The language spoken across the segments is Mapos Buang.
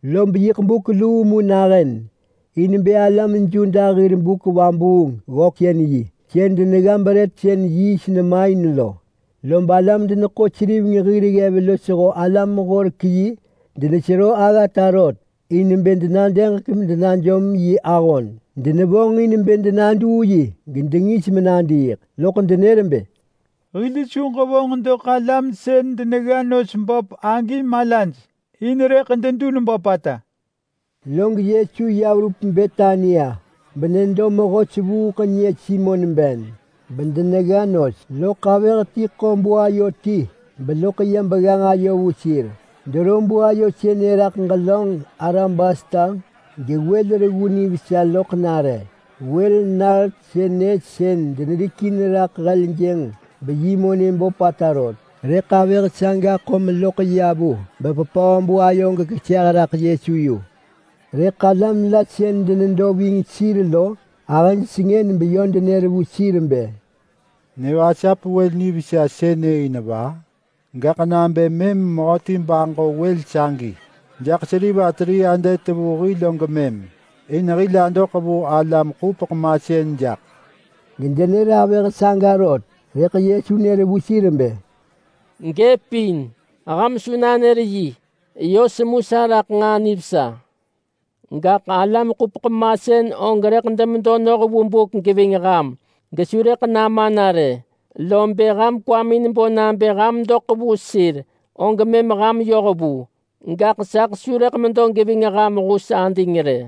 Lob yiḳ buk luu mu nahën in bë alam Yuda hir buk-vabuung-ggöksën-yi sën denegga brët sën yiist nema in lo. Lob alam-deneḳo-seriveng hir ggev losho alam-horek-yi denesero aggata rot in bë denadëġek medenajom yi ahon. Denevonġ in bë denaduu yi gedengis menadiiḳ. Loḳ denër bë, “Hil su ġevonġ doḳ alam sën denegga nos böp agi malaj, in rëḳ dedun böpata.” Log Yesu ya verup Betania benedo mehö sevuuḳnyë Simon ben. Denedo bemedo denegga nos, loḳ avëh ti ḳo buayo ti beya begganġ ayo vu sir. Dero buayo sënë raḳ ġelönġ alabasta gewël reggu nivesa loḳ nare. Wël nart sënë sën denerikin raḳ heljënġ beyi monë böpata rot, rëḳ avëh saga ḳo meloḳ ya vu beveröp buayo raḳ gekeseh raḳ Yesu yu. Rëḳ alam la sën denedo ving sir lo ahëj sengën meyö denër vu sir bë, “Nevasap wël nivesa sënë in va? Gaḳ nabë mëm mehöti baġo wël sagi jaḳ K300 vu hil og mëm, in hil adoḳ vu alam-ḳupeḳ-masën jaḳ!” Gedenër avëh saga rot. Rëḳ Yesu nër vu sir bë, “Gëpin! Ham su nanër yi! Yö semu sa raḳ nġaa nivesa. Gaḳ alam-ḳupeḳ-masën og rëḳ demedo noh vu buk geving ham gesu rëḳ nama na rë, lob bë ham kwamin bo nabë ham doḳ vu sir, og mëm ham yoh vu. Gaḳ saḳ su rëḳ medo geving ham hus ading rë.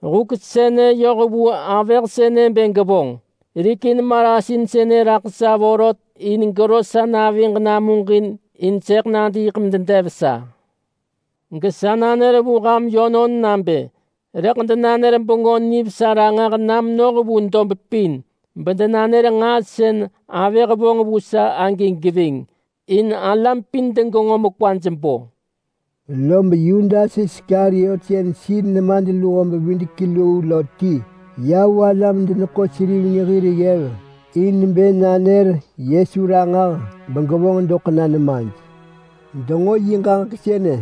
Huk sënë yoh vu avëh sënë bë gevonġ. Rikin marasin sënë raḳ sa vorot in gero sa naviġ namuġin in sëḳ nadiiḳ mededev sa. Gesa nanër vu ham yönon nabë: Rëḳ denanër Bengö Nivesa ranġah na menoh vu dob pin bedenanër nġaa sën avëh vonġ vu sa agi geving, in alam pin degenġo mekwaj bo.” Lob Yudas Iskariot sën sir nemadluho-bevidek-luu lo ti ya vu alam-deneḳo-seriveng hir ggev in bë nanër Yesu ranġah begevonġ doḳ na nemaj. Denġo yi ġaġek sënë,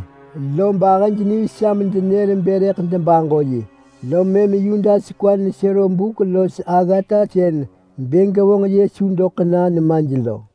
lob ahëj nivesa medenër bë rëḳ debaġo yi, lom mëm Yudas kwa nesero buk los aggata sën bë gevonġ Yesu doḳ na nemaj lo.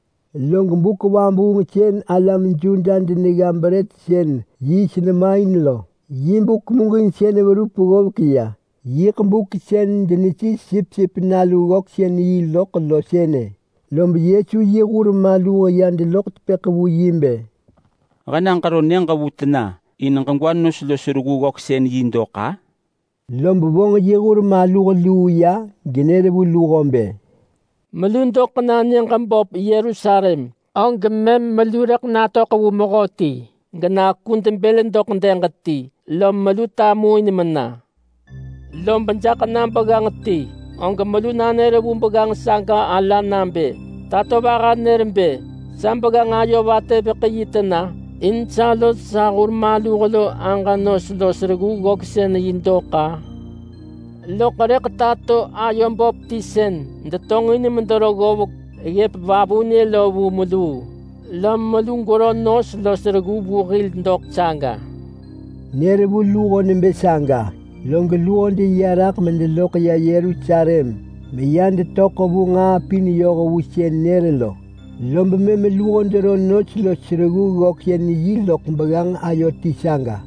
Log buk vabuung sën alam Yuda denegga brët sën yiist nema in lo yi buk muġinsën verup ggovek ya. Yiḳ buk sën denesis sipsip nalu ggöksën-yi loḳ lo sënë, lob Yesu yi hur maluh ya deloḳ tepëḳ vu yi bë, “He na ġero nyëġ vu tena in ġegwa nos los reggu ggöksën-yi dok-a?” Lob vonġ yi hur maluh luu ya genër vu luho bë, “Melu doḳ na nyëġ böp Yerusalem, og mëm melu rëḳ natöḳ vu mehöti genakud bël doḳ dëg ti, lom melu tamuin mena. Lob jaḳ na begganġ ti, og melu nanër vu begganġ saga ala nabë, ‘Tatovaha nër bë, “Sa begganġ ayo vatëveḳ yi tena in sa los sa hur maluh lo aġa nos los reggu ggöksën-yi dok-a?” ’ Loḳ rëḳ tato ayo böp ti sën detonġin medero ggovek ggëp vavunë lo vu meluu, lom melu gwero nos los reggu vu hil doḳ saga.” Nër vu luho nebë saga, log luho deya raḳ medeloḳ ya Yerusalem meya detöḳ vu nġaa pin yoh vu sën nër lo, lob mëm luho dero nos los reggu ggöksën-yi loḳ begganġ ayo ti saga.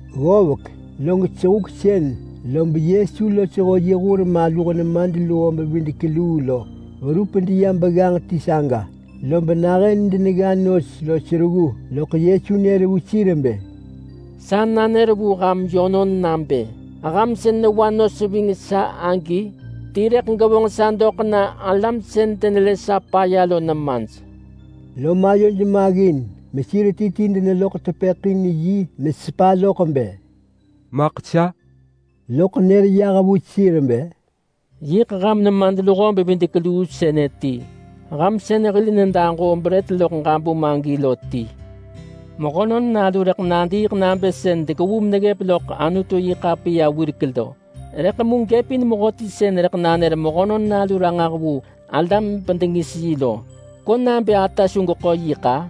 Ggovek, log sehuksën lob Yesu losho yi hur maluh nemadluho-bevidek-luu lo verup deya begganġ ti saga. Lob nahën denegga nos los reggu, loḳ Yesu nër vu sir bë, “Sa nanër vu ham yönon nabë ham sën newa nos ving sa agi ti rëḳ gevonġ sa doḳ na alam sën denelë sa paya lo nemaj.” Lom ayoj maggin mesir ti ti deneloḳ tepëḳ in yi mesepa loḳ bë, “Maḳ sa?” Loḳ nër yah vu sir bë, “Yiḳ ham nemadluho-bevidek-luu sënë ti. Ham sën hil nedaġoo brët loḳ ġabum agi lo ti. Mehönon Nalu rëḳ nadiiḳ nabë sën dekevu meneggëp loḳ Anutu-yi-ḳapiya wirek lo, rëḳ mu gëp in mehöti sën rëḳ nanër Mehönon Nalu ranġah vu alam bedengis yi lo. Ko nabë ata su geḳo yi-ḳa?”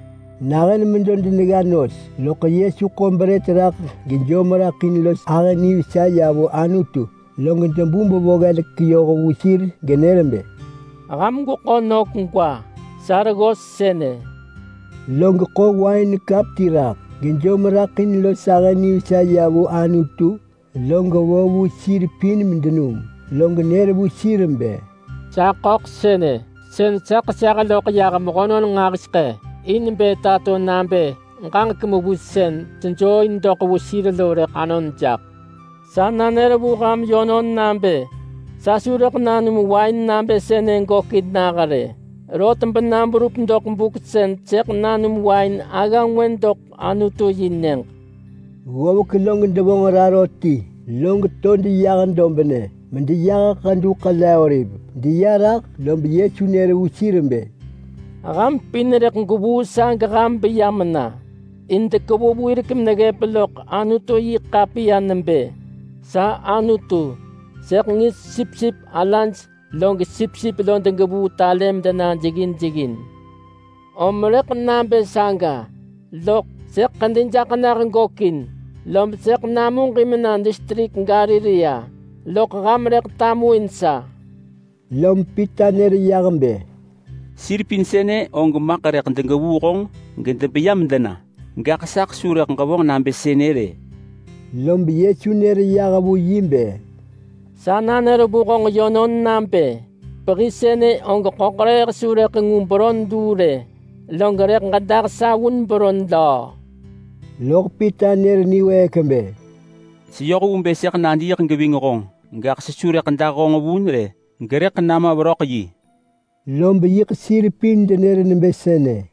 Nahën medo denegga nos, loḳ Yesu ḳo brët raḳ gejom raḳ in los ahë nivesa ya vu Anutu. Log debu bevo ggelek yoh vu sir genër bë, “Ham gweḳo nök gwa! Sa reggos sënë!”. Log ḳo wain kap ti raḳ, gejom raḳ in los ahë nivesa ya vu Anutu, log vo vu sir pin medenum. Log nër vu sir bë, “Sa ḳöḳ sënë, sën sa ḳeseh loḳ yah mehönon nġahiseḳë in bë tato nabë ġaġek mewis sën sejoo in doḳ vu sir lo rëḳ anon jaḳ. Sa nanër vu ham yönon nabë sa su rëḳ nanum wain nabë sënë gökin nah rë, rot bena berup doḳ buk sën sëḳ nanum wain agga ngwë doḳ Anutu-yi-nyëġ.” Ggovek log devonġ raro ti, log to deyah dobnë medeyah Ḳedu Ḳele-oliv. Deya raḳ lob Yesu nër vu sir bë, “Ham pin rëḳ gwevuu sa geham beya mena. In dekevu wirek meneggëp loḳ Anutu-yi-ḳapiya nebë: ‘Sa Anutu, sëḳ ngis sipsip alaj log sipsip lo degevuu talë medena jeggin jeggin.’ Om rëḳ nabë saga, loḳ sëḳ ḳedi jaḳ nah gökin, lob sëḳ namuġin mena distrik Galilea, loḳ ham rëḳ tamuin sa.” Lom Pita nër yah bë, “Sir pin sënë og maḳ rëḳ degevuu honġ gedebeya medena, gaḳ saḳ su rëḳ ġevonġ nabë sënë rë!” Lob Yesu nër yah vu yi bë, “Sa nanër vu honġ yönon nabë pehi sënë og ḳöḳrëëh su rëḳ ngu beron luu rë, log rëḳ ġedah sa vun beron löö!” Loḳ Pita nër niwëëk bë, “Seyoh vu bë sëḳ nadiiḳ geving honġ, gaḳ sesu rëḳ dah honġ vun rë, gerëḳ nama veröḳ yi!” Lob yiḳ sir pin denër nebë sënë.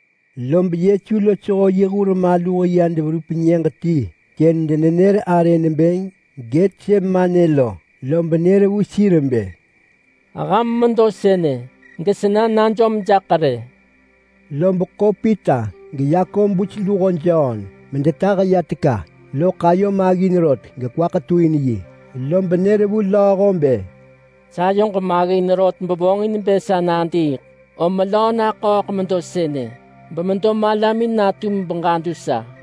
Lob Yesu losho yi hur maluh ya deverup nyëġ ti sën denenër arë nebë Getsemane lo, lob nër vu sir bë, “Ham medo sënë, gesena najom jaḳ rë!” Lob ḳo Pita geYakobus luho Jon medetah ya teka, loḳ ayo maggin rot gekwa ketuin yi. Lob nër vu lööho bë, “Sayoġ maggin rot vonġin bë sa nadiiḳ, om melöö naḳööḳ medo sënë bemedo malamin natum beġadu sa.”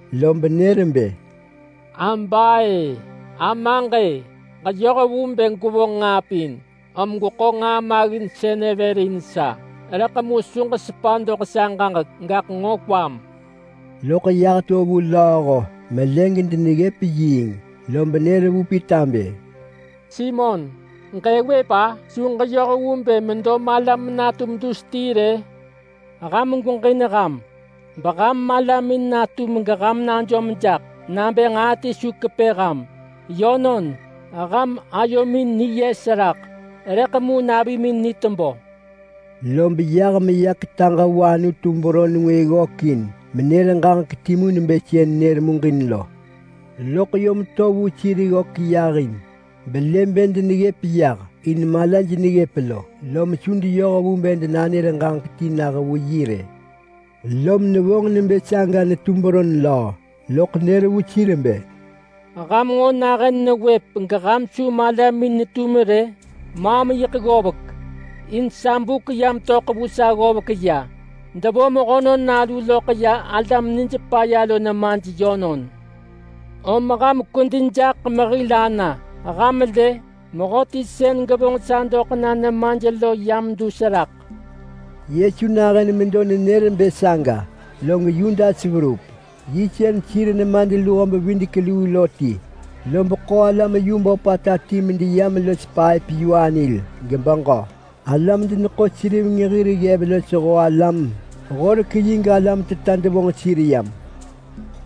Lob nër bë, “Aba-e! nebë Amaġ-e! Ġeyoh vu bë gwevonġ nġaa pin, om gweḳo nġaa maggin sënë vër in sa. Rëḳ mu su ġesepa doḳ sa ġaġek, gaḳ nġo kwam!” Loḳ yah meya vu lööho melë gedeneggëp yiing, lob nër vu Pita bë, “Simon, ġëëwëp-a? Su ġeyoh vu bë medo malam natum dus ti rë? Ham gweġin ham, beham malamin natum geham najom jaḳ nabë nġaa ti su kepë ham. Yönon, ham ayomin niyes raḳ, rëḳ mu navimin ni tebö!” Lob yah meya ketaġ vu Anutu beron ngwë ggökin menër ġaġek timu nebë sën nër muġin lo. Loḳ yom to vu sir ggök yahin belë bë deneggëp yah, in malaj neggëp lo. Lom su deyoh vu bë denanër ġaġek ti nah vu yi rë. Lom nevonġ nebë saga netu beron löö, loḳ nër vu sir bë, “Ham nġo nahën newëp geham su malamin netum rë? Maam yiḳ ggovek, in sa buk yam töḳ vu sa ggovek ya! Devo Mehönon Nalu loḳ ya alam nij paya lo nemaj yönon! Om ham kwedi jaḳ mehil ana! Ham lë! Mehöti sën gevonġ sa doḳ na nemaj lo yam dus raḳ!” Yesu nahën medo nenër bë saga log Yudas verup. Yi sën sir nemadluho-bevidek-luu lo ti, lob ḳo alam yu böpata ti medeyam los paëp-yu-anil gebeġö. Alam-deneḳo-seriveng hir ggev losho alam-horek-yi, galam teta devonġ sir yam.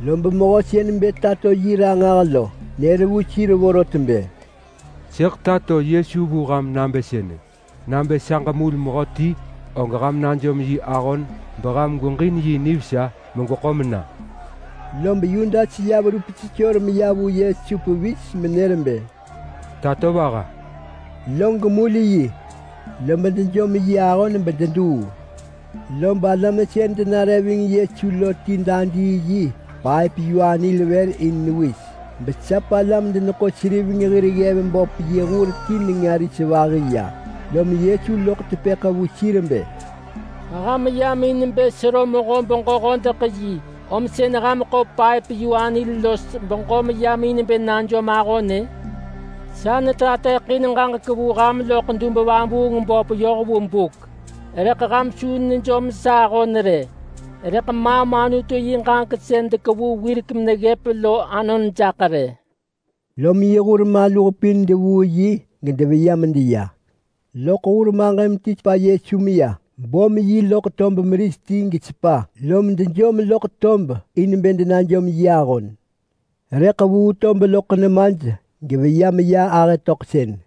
Lob mehö sën bë tato yi ranġah lo nër vu sir vorot bë, “Sëḳ tato Yesu vu ham nabë sënë: Nabë sa ġemul mehöti, og ham najom yi ahon beham gweġin yi nivesa megweḳo mena.” Lob Yudas ya verup sesor meya vu Yesu pevis menër bë, “Tatovaha!” log mul yi. Lob dejom yi ahon bededuu. Lob alam sën denare ving Yesu lo ti dadii yi paëp-yu-anil vër in newis besap alam-deneḳo-seriveng hir ggev böp yi hur ti nenga ris vahi ya. Lom Yesu loḳ tepëḳ vu sir bë, “Ham yam in bë sero mehö-beġö-hodeḳ-yi, om sën ham ḳo paëp-yu-anil los beġö meyam in bë najom ahon-ë? Sa netateḳin ġaġek vu ham loḳ dub-vabuung-böp yoh vu buk, rëḳ ham su nejom sa ahon rë! Rëḳ maam Anutu yi ġaġek sën dekevu wirek meneggëp lo anon jaḳ rë!” Lom yi hur maluh pin devuu yi gedeveya medeya. Loḳ hur maġëm ti sepa Yesu meya. Bom yi loḳ tob meris ti gesepa, lom dejom loḳ tob in bë denajom yi ahon. Rëḳ vuu tob loḳ nemaj geveya meya ahë töḳsën.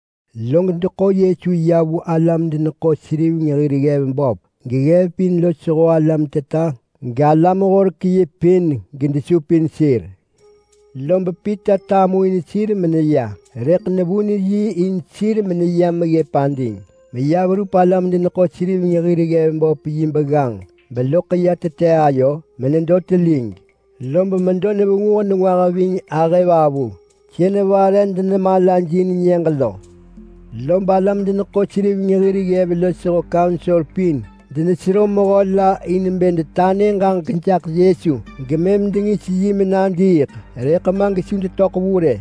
Log deḳo Yesu ya vu alam-deneḳo-seriveng hir ggev böp, geggev pin losho alam teta galam-horek-yi pin denesupin sir. Lob Pita tamuin sir meneya, rëḳ nevun yi in sir meneyam ggëp ading, meya verup alam-deneḳo-seriveng hir ggev böp yi begganġ beloḳ ya tete ayo menedo telig. Lob medo nevenguh nengwah ving ahëvavu sën denare medenemalajin nyëġ lo. Lob alam-deneḳo-seriveng hir ggev losho kaunsor pin denesero mehö la in bë denanër ġaġek jaḳ Yesu gemëm dengis yi menadiiḳ, rëḳ ma gesu detöḳ vu rë.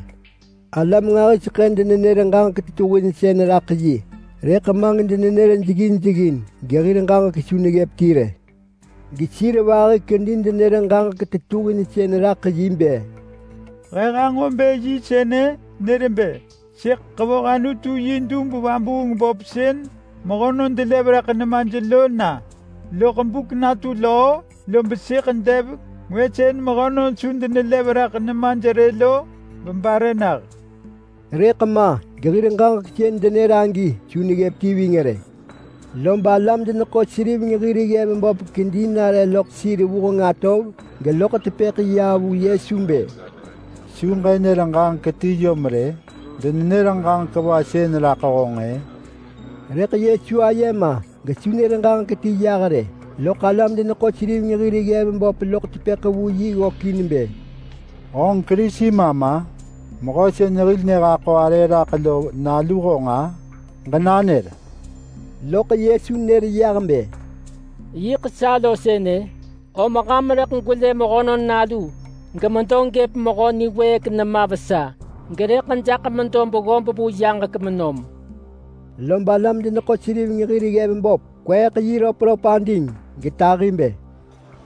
Alam nġahiseḳë denenër ġaġek tetuhinsën raḳ yi, rëḳ ma gedenenër jeggin jeggin, gehir ġaġek su neggëp ti rë. Gesir vahi kedi denër ġaġek tetuhinsën raḳ yi bë, “He hanġo bë yi sënë nër bë, ‘Sëḳ ḳevoh Anutu yi dub-vabuung-böp sën mehönon delev raḳ nemaj lo na, loḳ buk natu löö lob sëḳ dev ngwë sën mehönon su denelev raḳ nemaj rë lo bebare nah.’” Rëḳ ma gehir ġaġek sën denër agi su neggëp ti ving rë. Lob alam-deneḳo-seriveng hir ggev böp kedi nare loḳ sir vuheng atov geloḳ tepëḳ ya vu Yesu bë, “Su ġënër ġaġek ti yom rë? Mehönon sënë denenër ġaġek va sën raḳ honġ-ë?” Rëḳ Yesu aye ma gesu nër ġaġek ti yah rë. Loḳ alam-deneḳo-seriveng hir ggev böp loḳ tepëḳ vu yi ggökin bë, “Honġ Kerisi ma ma? Mehö sën hil nehaḳo arë raḳ lo nalu honġ-a? Ġenanër!” Loḳ Yesu nër yah bë, “Yiḳ sa lo sënë! Lob ham rëḳ gwelë Mehönon Nalu gemedo gëp Mehö Niwëëk nema vesa, gerëḳ jaḳ medo beggob vu yaġek menom.” Lob alam-deneḳo-seriveng hir ggev böp kweeḳ yi röpröp ading getahi bë,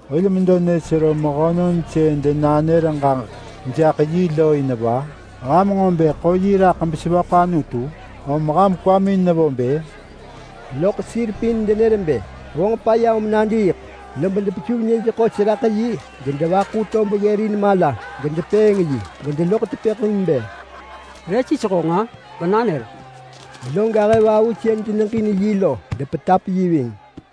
“Hil medo nesero mehönon sën denanër ġaġek jaḳ yi lo in va? Ham nġo bë ḳo yi raḳ besevöḳ Anutu? Om ham kwamin nevo bë?” Loḳ sir pin denër bë vonġ paya om nadiiḳ. Lob depesuv nyëj ḳos raḳ yi gedevaḳu tob ggërin mala gedepëëng yi gedeloḳ tepëḳ in bë, “Re sis honġ-a? Ġenanër!” Lob ahëvavu sën deneġin yi lo depetap yi ving.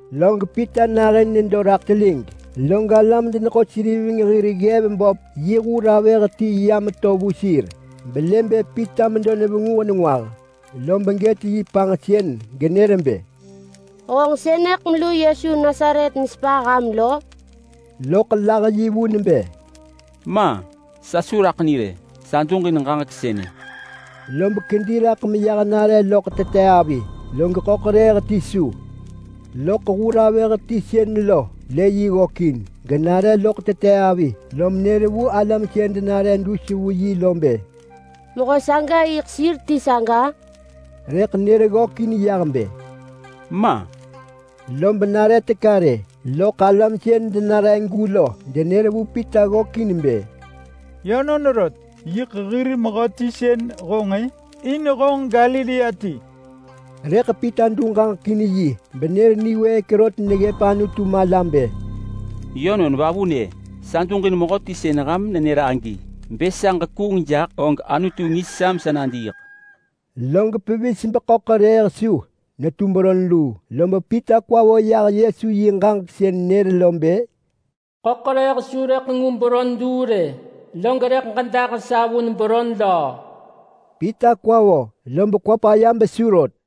Log Pita nahën nedo raḳ telig, log alam-deneḳo-seriveng hir ggev böp yi hur avëh ti yam to vu sir belë bë Pita medo nevenguh nengwah, lob gët yi panġsën genër bë, “Honġ sënëḳ melu Yesu Nasaret nesepa ham!” Rëḳ lah yi vun bë, “Ma! Sa su raḳ ni rë! Sa duġin honġ ġaġek sënë.” Lob kedi raḳ meyah nare loḳ tete avi, log ḳöḳrëëh ti su. Loḳ hur avëh ti sën lo lë yi ggökin genare loḳ tete avi, lom nër vu alam sën denare dus vu yi lo bë, “Mehö saga yiḳ sir ti saga!” Rëḳ nër ggökin yah bë, “Ma!” Lob nare teka rë, loḳ alam sën denaregu lo denër vu Pita ggökin bë, “Yönon rot! Yiḳ hir mehöti sën honġ-ë! In honġ Galilea ti!” Rëḳ Pita du ġaġek in yi benër niwëëk rot neggëp Anutu mala bë, “Yönon vavunë! Sa duġin mehöti sën ham nenër agi! Bë sa ġekuung jaḳ og Anutu ngis sa mesa nadiiḳ.” Log pevis beḳöḳrëëh su netu beron luu, lob Pita kwa vo yah Yesu yi ġaġek sën nër lo bë, “Ḳöḳrëëh su rëḳ ngu beron luu rë, log rëḳ ġedah sa vun beron löö.” Pita kwa vo lob kwa paya besu rot.